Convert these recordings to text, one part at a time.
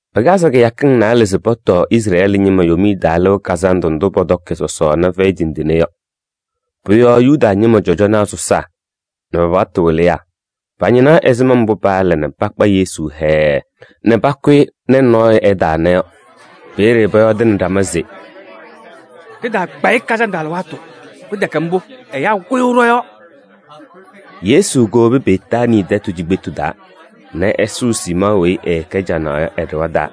Pɩkazɩ kɩyakɩŋ naalɛ se pɔtɔɔ Izrɛɛlɩ ñɩma Yomiye Taa Lɩʋ Kazandʋ ndʋ pɔtɔkɩ sɔsɔɔna fɛyɩ tindine yɔ. Pʋ-yɔɔ Yuda ñɩma cɔjɔnaa sɔsaa nɛ pa-paɣtʋ wɩlɩyaa pañɩnaɣ ɛzɩma mbʋ paala nɛ pakpa Yesu hɛɛɛ nɛ pakʋ-ɩ nɛ nɔɔyʋ ɛtaana yɔ. Peeye pɔyɔɔdɩnɩ ɖama se: “Ɖɩtaakpa-ɩ kazandʋ alɩwaatʋ, pɩtɛkɛ mbʋ, ɛyaa kʋyʋʋ ɖɔ-yɔɔ.” Yesu kowobi Betaanii tɛtʋ cikpetu taa nɛ ɛsʋʋ Siimɔɔ weyi ɛɛkɛ canaɣ yɔ ɛ-ɖɩɣa taa.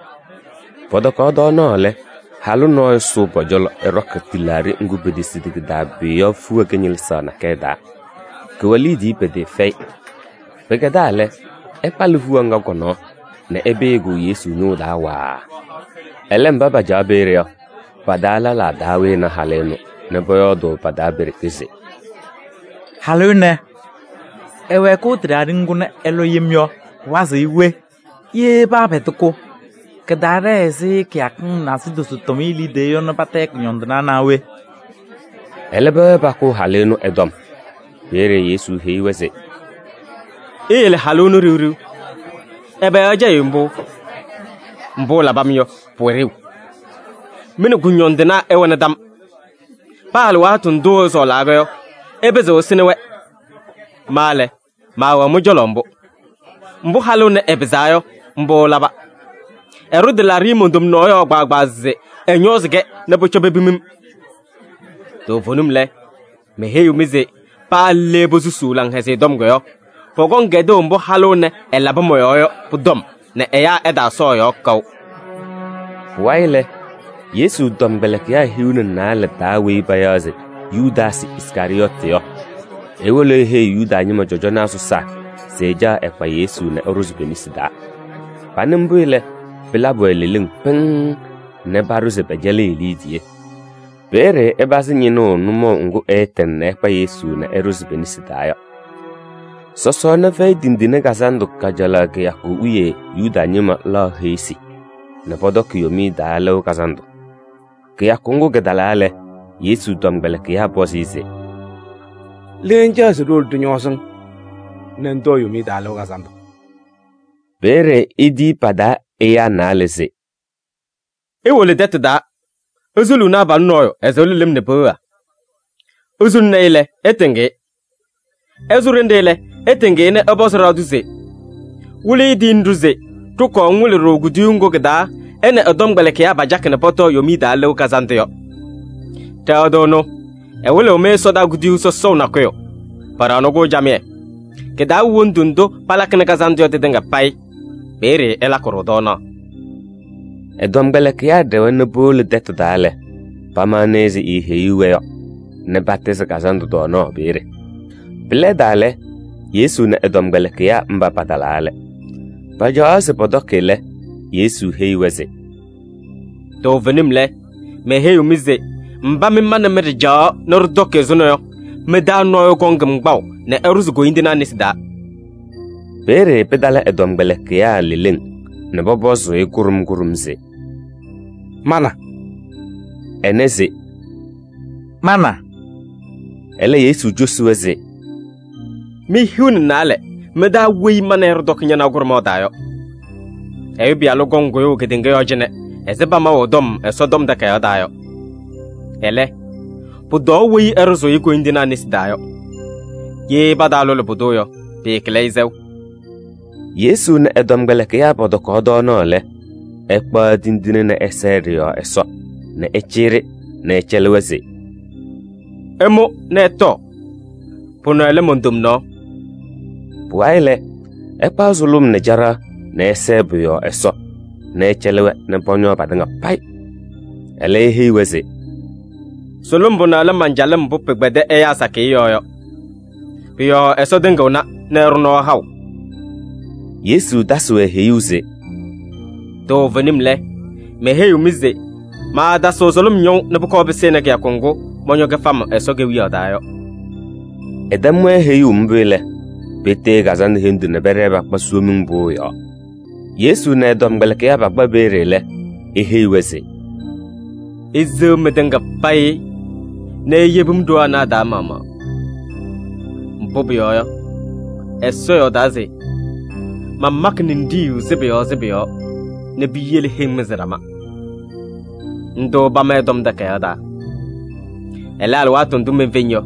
Pɔtɔkaɣ tɔɔnaɣ lɛ, halʋ nɔɔyʋ sʋʋ pɔ-cɔlɔ, ɛɖɔkɩ tɩlaaɖɩ ŋgʋ petesidi kɩ-taa pʋyʋ yɔ fiɣa kɩñɩlɩzaɣ nakɛyɛ taa. Kʋwɛ liidiye pɩtɩɩfɛyɩ. Pɩkɛdaa lɛ, ɛkpalɩ fiɣa ŋga kɔ-nɔɔ nɛ ɛpɩyɩ-kʋ Yesu ñʋʋ taa waaa. Ɛlɛ mba pacaɣ peeye yɔ, pa-taa lɛlaa taa wɩnɩ halʋ ɛnʋ nɛ pɔyɔɔdʋʋ pa-taa pe-ɖeke se: “Halʋ ɛnɛ, ɛwɛɛkʋʋ tɩlaaɖɩ ŋgʋ nɛ ɛlɔ yem yɔ, pɩwazɩɣ-ɩ we? Ye paapɛdɩ-kʋ, kɩtaaɖɛɛ ɛzɩ kɩyakɩŋ nasidozo tʋmɩyɛ liidiye yɔ nɛ patayɩ kʋñɔndɩnaa naa we?” Ɛlɛ pɛwɛɛ pakʋʋ halʋ ɛnʋ ɛ-tɔm. Peeye Yesu heyi-wɛ se: “Iyele halʋ ɛnʋ ɖiɣ ɖiɣ. Ɛbɛ yɔɔ ɩcɛyɩɣ-ɩ mbʋ? Mbʋ ɛlabɩ-m yɔ, pʋwɛ ɖeu. Mɩ nɛ kʋñɔndɩnaa ɩwɛna tam. Paa alɩwaatʋ ndʋʋ ɩsɔɔlaa yɔ, ɩpɩzɩɣ ɩsɩnɩ-wɛ. Ma lɛ, maawɛɣ mɩ-cɔlɔ mbʋ. Mbʋ halʋ ɛnɛ ɛpɩzaa yɔ, mbʋ ɛlaba. Ɛɖʋ tɩlaaɖɩ mon-tomnaɣ yɔɔ kpaagbaa se ɛñɔɔzɩ-kɛ nɛ pʋcɔ pepim-m. Toovenim lɛ, meheyiɣ-mɩ se paa le posusuu Laŋhɛzɩyɛ Tɔm yɔ, pɔkɔŋ kɛdʋʋ mbʋ halʋ ɛnɛ ɛlabɩ mɔ-yɔɔ yɔ pʋ-tɔm nɛ ɛyaa ɛtaasɔɔ ɛ-yɔɔ kaʋ.” Pʋwayɩ lɛ, Yesu tɔmkpɛlɩkɩyaa hiu nɛ naalɛ taa weyi payaɣ se Yudaasɩ Iskarɩyɔɔtɩ yɔ, ewolo eheyi Yuda ñɩma cɔjɔnaa sɔsaa se ɛcaɣ ɛkpa Yesu nɛ ɛɖʋzɩ pe-nesi taa. Panɩ mbʋ lɛ, pɩlabɩ-wɛ leleŋ pɩŋŋ nɛ paɖʋ se pɛcɛlɩɣ-ɩ liidiye. Peeye ɛpazɩ ñɩnʋʋ nʋmɔʋ ŋgʋ ɛɛtɩŋ nɛ ɛkpa Yesu nɛ ɛɖʋzɩ pe-nesi taa yɔ. Sɔsɔɔna Fɛyɩ Tindine Kazandʋ kajalaɣ kɩyakʋ wiye Yuda ñɩma laɣ heɣsi nɛ pɔtɔkɩ po-Yomiye Taa Lɩʋ Kazandʋ. Kɩyakʋ ŋgʋ kɩtalaa lɛ, Yesu tɔmkpɛlɩkɩyaa pɔzɩ-ɩ se: “Le ŋcaɣ se ɖiwolo ɖɩñɔɔzɩ-ŋ nɛ ŋtɔɔ Yomiye Taa Lɩʋ Kazandʋ?” Peeye etiyi pa-taa ɛyaa naalɛ se: “Iwolo tɛtʋ taa, isuluuni abalʋ nɔɔyʋ, ɛsɩɣlɩ lɩm nɛ peɣa. Isuluni-i lɛ, ɩtɩŋ-ɩ. Ɛsʋ ɖenɖe lɛ, ɩtɩŋ-ɩ nɛ ɩpɔzɩ ɖɩɣa tʋ se: ‘Wɩlɩyʋ tiyini-ɖʋ se ɖɩkɔɔ ŋwɩlɩ-ɖʋ kuduyuu ŋgʋ kɩ-taa ɛ nɛ ɛ-tɔmkpɛlɩkɩyaa pacakɩ nɛ pɔtɔɔ Yomiye Taa Lɩʋ Kazandʋ yɔ.’ Ɖɩɣa tʋ ɛnʋ ɛwɩlɩɣ-mɩ ɛsɔdaa kuduyuu sɔsɔʋ nakʋyʋ, paɖaɣnɩ-kʋ camɩyɛ. Kɩ-taa wɛ wondu ndʋ palakɩnɩ kazandʋ yɔ tɩtɩŋa payɩ, peeye ɩlakɩ-ɖʋ tɔɔnaɣ.” Ɛ-tɔmkpɛlɩkɩyaa ɖɛwa nɛ powolo tɛtʋ taa lɛ, pamaɣna ɛzɩ eeheyuu-wɛ yɔ nɛ patɩzɩ kazandʋ tɔɔnaɣ peeye. Pɩlɛdaa lɛ, Yesu nɛ ɛ-tɔmkpɛlɩkɩyaa mba patalaa lɛ. Pacaɣaɣ se pɔtɔkɩ lɛ, Yesu heyi-wɛ se: “Toovenim lɛ, meheyiɣ mɩ se mba mɩ ma nɛ mɩ ɖɩcaɣaɣ nɛ ɖɩtɔkɩ ɛzʋnɔ yɔ, mɩ-taa nɔɔyʋ kɔŋ-m kpaʋ nɛ ɛɖʋzɩ koyindinaa nesi taa.” Peeye pɩtala ɛ-tɔmkpɛlɩkɩyaa leleŋ nɛ pɔpɔzʋʋ-ɩ kʋɖʋm kʋɖʋm se: “Ma na?” Ɛnɛ se: “Ma na?” Ɛlɛ Yesu cosi-wɛ se: “Mi-hiu nɛ naalɛ mɩ-taa weyi ma nɛ ɩ ɖɩtɔkɩ ñanaɣ kʋɖʋmaɣ taa yɔ.” “Ɛyʋ Pɩyalʋ kɔŋ kʋyʋʋ kedeŋa yɔɔ cɩnɛ ɛzɩ pamaʋ ɛ-tɔm Ɛsɔtɔm Takayaɣ taa yɔ. Ɛlɛ, pʋtɔɔ weyi ɛɖʋzʋʋ-ɩ koyindinaa nesi taa yɔ! Ye pataalʋlɩ pʋdʋ yɔ, pɩɩkɩlɩ-ɩ sɛʋ.” Yesu nɛ ɛ-tɔmkpɛlɩkɩyaa pɔtɔkaɣ tɔɔnaɣ lɛ, ɛkpaɣ tindine nɛ ɛsɛɛ ɖɩ-yɔɔ Ɛsɔ nɛ ɛcɩyɩ-ɖɩ nɛ ɛcɛlɩ-wɛ se: “Ɩmʋ nɛ ɩtɔɔ, pʋnɛ lɛ mon-tomnaɣ.” Pʋwayɩ lɛ, ɛkpaɣ sʋlʋm nɛ caɖaɣ nɛ ɛsɛɛ pʋ-yɔɔ Ɛsɔ nɛ ɛcɛlɩ-wɛ nɛ pɔñɔɔ patɩŋa payɩ. Ɛlɛ eheyi-wɛ se: “Sʋlʋm pʋnɛ lɛ man-calɩm mbʋ pɩkpɛdɩ ɛyaa sakɩyɛ yɔɔ yɔ. Pʋ-yɔɔ Ɛsɔ tɩŋɩɣna nɛ ɛɖʋ nɔɔ haʋ.” Yesu tasɩ-wɛ heyuu se: “Toovenim lɛ, meheyiɣ-mɩ se maatasɩɣ sʋlʋm ñɔʋ nɛ pʋkɔɔ pɩsɩnɩ kɩyakʋ ŋgʋ mɔñɔ kɩfam Ɛsɔ Kewiyaɣ taa yɔ.” Ɛtɛm-wɛ heyuu mbʋ lɛ, petee kazandʋ hendu nɛ pɛɖɛɛ pakpa Somiŋ Pʋʋ yɔɔ. Yesu nɛ ɛ-tɔmkpɛlɩkɩyaa pakpa peeye lɛ, eheyi-wɛ se: “Iseɣ mɩtɩŋa payɩ nɛ iyebi-m ɖoo anɛ a-taa maɣmaɣ. Mbʋ pʋyɔɔ yɔ, Ɛsɔ yɔɔdaa se: ‘Mamakɩ ninɖiɣyu sɩbʋ yɔɔ sɩbʋ yɔɔ nɛ piyele heŋ mɩzɩ ɖama.’ Ndʋ pama ɛ-Tɔm Takayaɣ taa. Ɛlɛ, alɩwaatʋ ndʋ menfeŋ yɔ,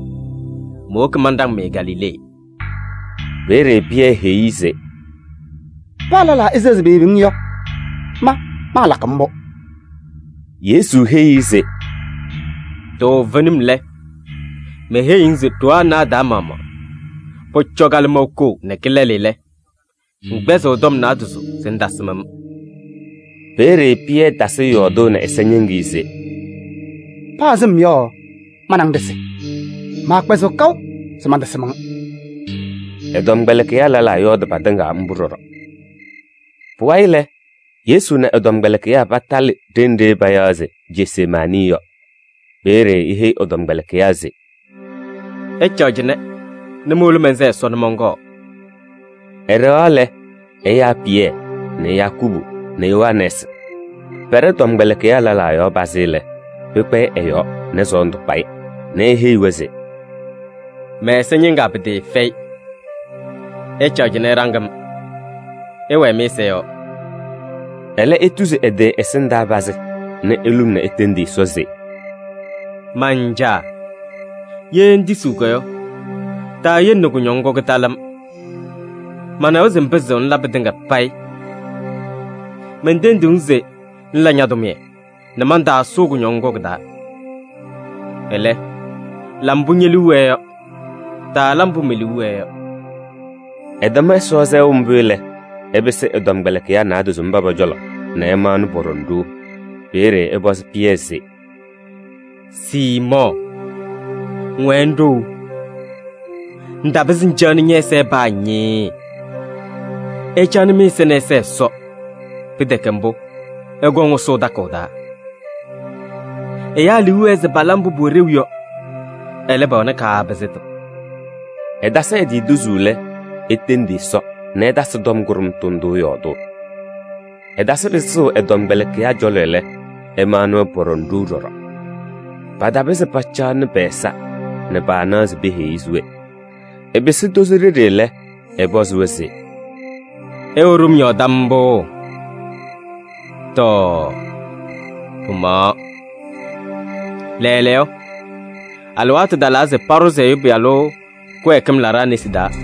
mowoki manɖaŋ-mɩ Galilee. Peeye Pɩyɛ heyi-i se: ‘Paa lɛlaa eseɣ patɩŋa se peyebi-ŋ yɔ, ma maalakɩ mbʋ.’” Yesu heyi-i se: “Toovenim lɛ, meheyiɣ-ŋ se ɖoo anɛ a-taa maɣmaɣ, pʋcɔ kalɩmɔʋ koo nɛ kɩlɛlɩ lɛ, ŋkpɛzɩɣ tɔm naadozo se ŋtasɩm-m.” Peeye Pɩyɛ tasɩ yɔɔdʋʋ nɛ ɛza ñɩŋɩyɛ se: “Paa sɩm yɔ, ma nɛ ŋ ɖɩsɩ, maakpɛzɩɣ kaʋ se mantasɩm-ŋ.” Ɛ-tɔmkpɛlɩkɩyaa lɛlaa yɔɔdɩ patɩŋa mbʋ ɖɔɖɔ. Pʋwayɩ lɛ, Yesu nɛ ɛ-tɔmkpɛlɩkɩyaa patalɩ ɖenɖe payaɣ se Jesemaanɩ yɔ. Peeye eheyi ɛ-tɔmkpɛlɩkɩyaa se: “Ɩcaɣ cɩnɛ nɛ mowolo mɛnsɛɛ Ɛsɔ nɛ mɔnkɔɔ.” Ɛɖɛɣaɣ lɛ, ɛyaa Pɩyɛ nɛ Yakubu nɛ Yohanɛɛsɩ. Pɛɖɛ tɔmkpɛlɩkɩyaa lɛlaa yɔɔ pazɩ lɛ, pɩkpɛyɩ ɛ-yɔɔ nɛ sɔɔndʋ kpa-ɩ nɛ eheyi-wɛ se: “Mɛ-ɛza ñɩŋaa pɩtɩɩfɛyɩ. Ɩcaɣ cɩnɛ ɩɖaŋ-m, ɩwɛɛ mɩ-ɛza yɔɔ.” Ɛlɛ etuzi ɛ-tɩ ɛsɩndaa pazɩ nɛ eluŋ nɛ etendi Ɛsɔ se: “Man-Caa! Ye ŋtisiɣ yɔ, taayele nɛ kʋñɔŋ ŋgʋ kɩtalɩ-m. Manawa se ŋpɩzɩɣ ŋla pɩtɩŋa payɩ. Mentendiɣ-ŋ se ŋla ña-tʋmɩyɛ nɛ mantaasʋʋ kʋñɔŋ ŋgʋ kɩ-taa. Ɛlɛ, la mbʋ ñe-liu wɛɛ yɔ, taala mbʋ me-liu wɛɛ yɔ.” Ɛtɛm Ɛsɔ sɛʋ mbʋ lɛ, ɛpɩsɩ ɛ-tɔmkpɛlɩkɩyaa naadozo mba pɔ-cɔlɔ nɛ ɛmaɣna pɔɖɔŋ ɖou. Peeye ɛpɔzɩ Pɩyɛ se: “Siimɔɔ, ŋwɛɛ ŋɖou! Ŋtapɩzɩ ŋcaɣnɩ ñɛ-ɛza paa ñɩɩɩ! Ɩcaɣnɩ mɩ-ɛza nɛ ɩsɛɛ Ɛsɔ, pɩtɛkɛ mbʋ, ɩkɔŋ ɩsʋʋ takʋʋ taa. Ɛyaa liu wɛɛ se pala mbʋ pʋwɛ ɖeu yɔ, ɛlɛ, pɛwɛnɩ kaapɩzɩtʋ.” Ɛtasɩ ɛ-tɩ tuzuu lɛ, etendi Ɛsɔ nɛ ɛtasɩ tɔm kʋɖʋmtʋ ndʋ yɔɔdʋʋ. Ɛtasɩ pɩsʋʋ ɛ-tɔmkpɛlɩkɩyaa cɔlɔ lɛ, ɛmaɣnɩ-wɛ pɔɖɔŋ ɖou ɖɔɖɔ. Patapɩzɩ pacaɣnɩ pɛ-ɛza nɛ paanaɣ se peheyi-i se we. Ɛpɩsɩ tozo ɖeɖe lɛ, ɛpɔzɩ-wɛ se: “Ɩwɛ ɖom yɔɔ tam mbʋ? Tɔɔ, pɩmaɣaɣ! Lɛɛlɛɛyɔ alɩwaatʋ talaa se paɖʋzɩ Ɛyʋ Pɩyalʋ kɩwɛɛkɩm laɖaa nesi taa.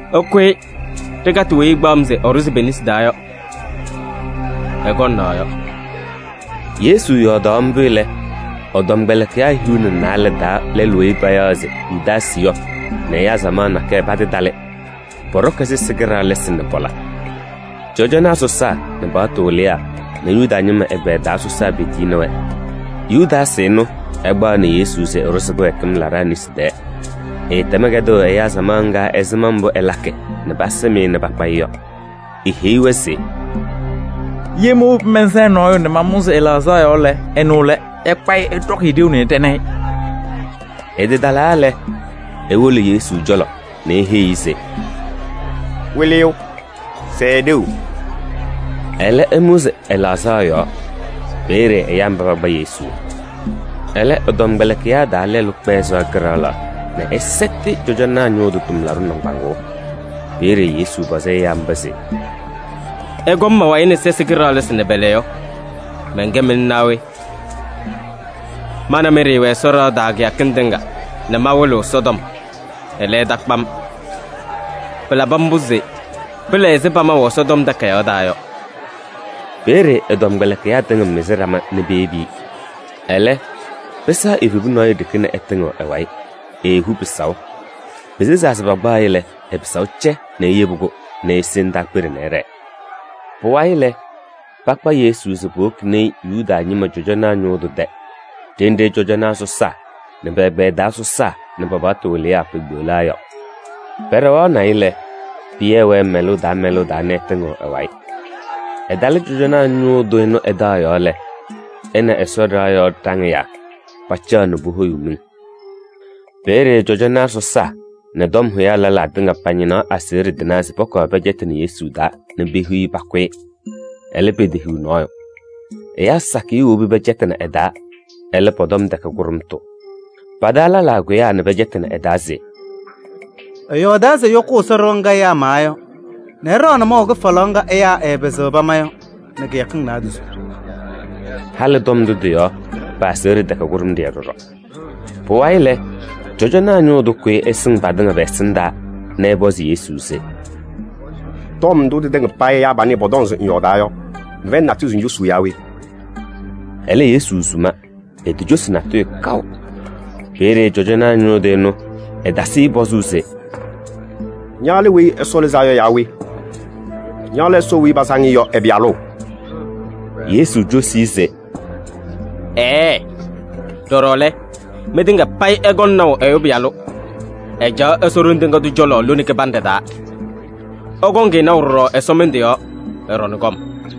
Ɩkʋyɩ ɖɩkatɩ weyi ɛkpaɣ-m se ɛɖʋzɩ pe-nesi taa yɔ! Ɛkɔŋ naɣ yɔ!” Yesu yɔɔdaɣ mbʋ lɛ, ɛ-tɔmkpɛlɩkɩyaa hiu nɛ naalɛ taa lɛlʋ weyi payaɣ se Yudaasɩ yɔ nɛ ɛyaa samaɣ nakɛyɛ patɩtalɩ. Pɔɖɔkɩ sɛsɩ kɩɖaɣlɩsɩ nɛ pɔla. Cɔjɔnaa sɔsaa nɛ paɣtʋ wɩlɩyaa nɛ Yuda ñɩma ɛgbɛyɛ taa sɔsaa petiyini-wɛ. Yudaasɩ ɛnʋ ɛkpaɣnɩ Yesu se ɛɖʋzɩ kɩwɛɛkɩm laɖaa nesi taa. Ɛɛtɛm kɛdʋʋ ɛyaa samaɣ ŋga ɛzɩma mbʋ ɛlakɩ nɛ pasɩm-ɩ nɛ pakpa-ɩ yɔ. Eheyi-wɛ se: “Ye mowobi mɛnsɛɛ nɔɔyʋ nɛ mamʋzɩ ɛ-laɣzaɣ yɔɔ lɛ, ɛnʋ lɛ. Ɩkpa-ɩ ɩɖɔkɩ-ɩ ɖeu nɛ ɩɖɛnɩ-ɩ.” Ɛtɩtalaa lɛ, ewolo Yesu cɔlɔ nɛ eheyi-i se: “Wɩlɩyʋ, sɛɛ ɖeu!” Ɛlɛ ɛmʋzɩ ɛ-laɣzaɣ yɔɔ. Peeye ɛyaa mba pakpa Yesu. Ɛlɛ, ɛ-tɔmkpɛlɩkɩyaa taa lɛlʋ kpɛɛ sɩɣa kɩɖaɣlaɣ nɛ ɛsɛtɩ cɔjɔnaa ñʋʋ tʋ tʋmlaɖʋ nɩŋgbaŋʋʋ. Peeye Yesu pɔzɩ ɛyaa mba se: “Ɩkɔm ma-wayɩ nɛ sɛsɩ kɩɖaɣlɩsɩ nɛ pɔla yɔ, mɛnkɛ mɩlʋ naa we? Ma nɛ mɩ ɖɩɩwɛ Ɛsɔ ɖɩɣa taa kɩyakɩŋ tɩŋa nɛ mawɩlɩɣ Ɛsɔtɔm, ɛlɛ, ɩtakpa-m. Pɩlabɩ mbʋ se pɩla ɛzɩ pamaʋ Ɛsɔtɔm Takayaɣ taa yɔ.” Peeye ɛ-tɔmkpɛlɩkɩyaa tɩŋa mɩzɩ ɖama nɛ peyebi-i. Ɛlɛ, pɩsɛɣ evebu nɔɔyʋ ɖeke nɛ ɛtɩŋɩɣ ɛ-wayɩ, eehu pɩsaʋ. Pesezaa se pakpaɣ-ɩ lɛ, ɛ-pɩsaʋ cɛ nɛ eyebi-kʋ nɛ ese ndaakpeɖe nɛ ɛɖɛɛ. Pʋwayɩ lɛ, pakpa Yesu se powokini-i Yuda ñɩma cɔjɔnaa ñʋʋ tʋ tɛ ɖenɖe cɔjɔnaa sɔsaa nɛ pɛ-ɛgbɛyɛ taa sɔsaa nɛ pa-paɣtʋ wɩlɩyaa pekpeɣlaa yɔ. Pɛɖɛɣaɣnɩ-ɩ lɛ, Pɩyɛ wɛɛ mɛlʋʋ taa mɛlʋʋ taa nɛ ɛtɩŋɩɣ ɛ-wayɩ. Ɛtalɩ cɔjɔnaa ñʋʋ tʋ ɛnʋ ɛ-taɣ yɔɔ lɛ, ɛ nɛ Ɛsɔ ɖɩɣa yɔɔ ɖaŋɩyaa pacaɣ nɛ pohoyuu miŋ. Peeye cɔjɔnaa sɔsaa nɛ tɔm hʋyaa lɛlaa tɩŋa pañɩnaɣ aseɣɖe tɩnaa se pɔkɔɔ pɛcɛtɩnɩ Yesu taa nɛ pehiɣ-i pakʋ-ɩ. Ɛlɛ, petehiɣ nɔɔyʋ. Ɛyaa sakɩyɛ wobi pɛcɛtɩnɩ ɛ-taa. Ɛlɛ, pɔ-tɔm tɛkɛ kʋɖʋmtʋ. Pa-taa lɛlaa kʋyaa nɛ pɛcɛtɩnɩ ɛ-taa se: “Ɛyɔɔdaa se ɛyɔkʋʋ Ɛsɔ ɖɩɣa ŋga ɛyaa mawa yɔ nɛ ɛɖaɣnɩ maʋ kɩfalaɣ ŋga ɛyaa ɩɩpɩzɩɣ pama yɔ nɛ kɩyakɩŋ naadozo.” Halɩ tɔm ndʋ tɩ-yɔɔ, pa-aseɣɖe tɛkɛ kʋɖʋmɖɩyɛ ɖɔɖɔ. Pʋwayɩ lɛ, cɔjɔnaa ñʋʋ tʋ kʋyɩ ɛsɩŋ patɩŋa pɛ-ɛsɩndaa nɛ ɛpɔzɩ Yesu se: “Tɔm ndʋ tɩtɩŋa payɩ ɛyaa panɛ pɔtɔŋ se ŋyɔɔdaa yɔ, ŋfɛyɩnɩ natʋyʋ se ŋcosuu yaa we?” Ɛlɛ, Yesu suma, etocosi natʋyʋ kaʋ. Peeye cɔjɔnaa ñʋʋ tʋ ɛnʋ, ɛtasɩ-ɩ pɔzʋʋ se: “Ña lɛ Weyi Ɛsɔ Lɩzaa Yɔ yaa we? Ña lɛ Ɛsɔ weyi pasaŋ-ɩ yɔ ɛ-Pɩyalʋ?” Yesu cosi-i se: “Ɛɛɛ! Ɖɔɖɔ lɛ, mɩtɩŋa payɩ ɩkɔŋ naʋ Ɛyʋ Pɩyalʋ, ɛcaɣ Ɛsɔ Ɖoŋ Tɩŋa Tʋ cɔlɔ lone kɩbanɖɛ taa. Ɩkɔŋ-ɩ naʋ ɖɔɖɔ ɛsɔmɩndʋ yɔɔ, ɛɖɔŋ kɔm.”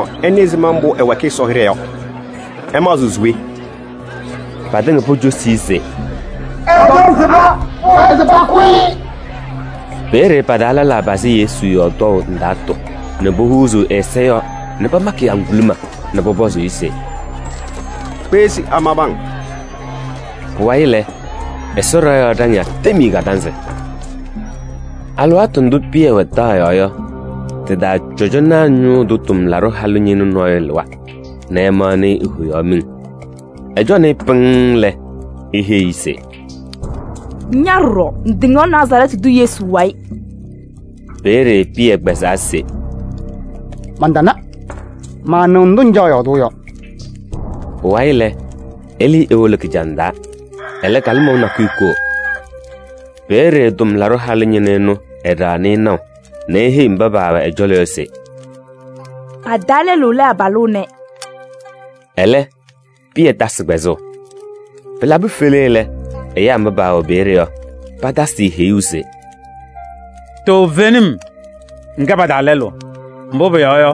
Mɩ-maɣmaɣ ɩnɩ ɛzɩma mbʋ ɛwɛɛkɩ Ɛsɔ hɩɖɛ yɔ. Ɩmaɣzɩɣ se we?” Patɩŋa pocosi-i se: “Ɛ-tɔm sɩba, pʋwɛɛ se pakʋ-ɩ!” Peeye pa-taa lɛlaa pazɩ Yesu yɔɔ tɔʋ ndaatʋ nɛ pohuuzuu ɛ-ɛza yɔɔ nɛ pamakɩ-ɩ ŋguluma nɛ pɔpɔzʋʋ-ɩ se: “Kpeɣ se amabɩ-ŋ.” Pʋwayɩ lɛ, Ɛsɔ ɖɩɣa yɔɔ ɖaŋɩyaa tem-i kadanzɩ. Alɩwaatʋ ndʋ Pɩyɛ wɛ taɣ yɔɔ yɔ, tɩ-taa cɔjɔnaa ñʋʋ tʋ tʋmlaɖʋ halʋ ñɩnʋ nɔɔyʋ lɩwa nɛ ɛmaɣnɩ-ɩ, ehoyaɣ miŋ. Ɛcɔnɩ-ɩ pɩŋŋ lɛ, eheyi-i se: “Ña ɖɔɖɔ, ŋtɩŋaɣ Nazarɛɛtɩ tʋ Yesu wayɩ.” Peeye Pɩyɛ kpɛzaa se: “Mantana, maanɩɣ ndʋ ŋcaɣ yɔɔdʋʋ yɔ.” Pʋwayɩ lɛ, ɛlɩɩ ewolo kɩjaŋ taa. Ɛlɛ kalɩmɔʋ nakʋyʋ koo. Peeye tʋmlaɖʋ halʋ ñɩnʋ ɛnʋ, ɛɖaɣnɩ-ɩ naʋ nɛ eheyi mba paawɛ ɛ-cɔlɔ yɔ se: “Pa-taa lɛlʋ lɛ abalʋ ɛnɛ.” Ɛlɛ, Pɩyɛ tasɩ kpɛzʋʋ. Pɩlabɩ fele lɛ, ɛyaa mba paawɛ peeye yɔ, patasɩ-ɩ heyuu se: “Toovenim! Ŋkɛ pa-taa lɛlʋ, mbʋ pʋyɔɔ yɔ,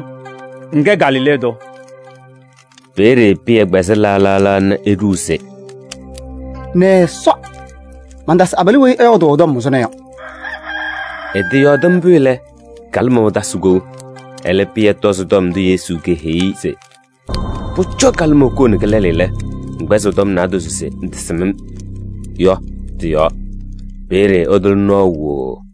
ŋkɛ Galilee tʋ.” Peeye Pɩyɛ kpɛzɩ laɣ laɣ nɛ eɖuu se: “Nɛ Ɛsɔ! Mantasɩ abalʋ weyi ɩyɔɔdʋʋ ɛ-tɔm ɛzʋnɔ yɔ!” Ɛtɩyɔɔdɩ mbʋ lɛ, kalɩmɔʋ tasɩ kou. Ɛlɛ, Pɩyɛ tɔzɩ tɔm ndʋ Yesu keheyi-i se: “Pʋcɔ kalɩmɔʋ koo nɛ kɩlɛlɩ lɛ, ŋkpɛzɩɣ tɔm naadozo se ŋtasɩm-m” yɔ tɩ-yɔɔ, peeye ɛtʋlɩ nɔɔ wooo.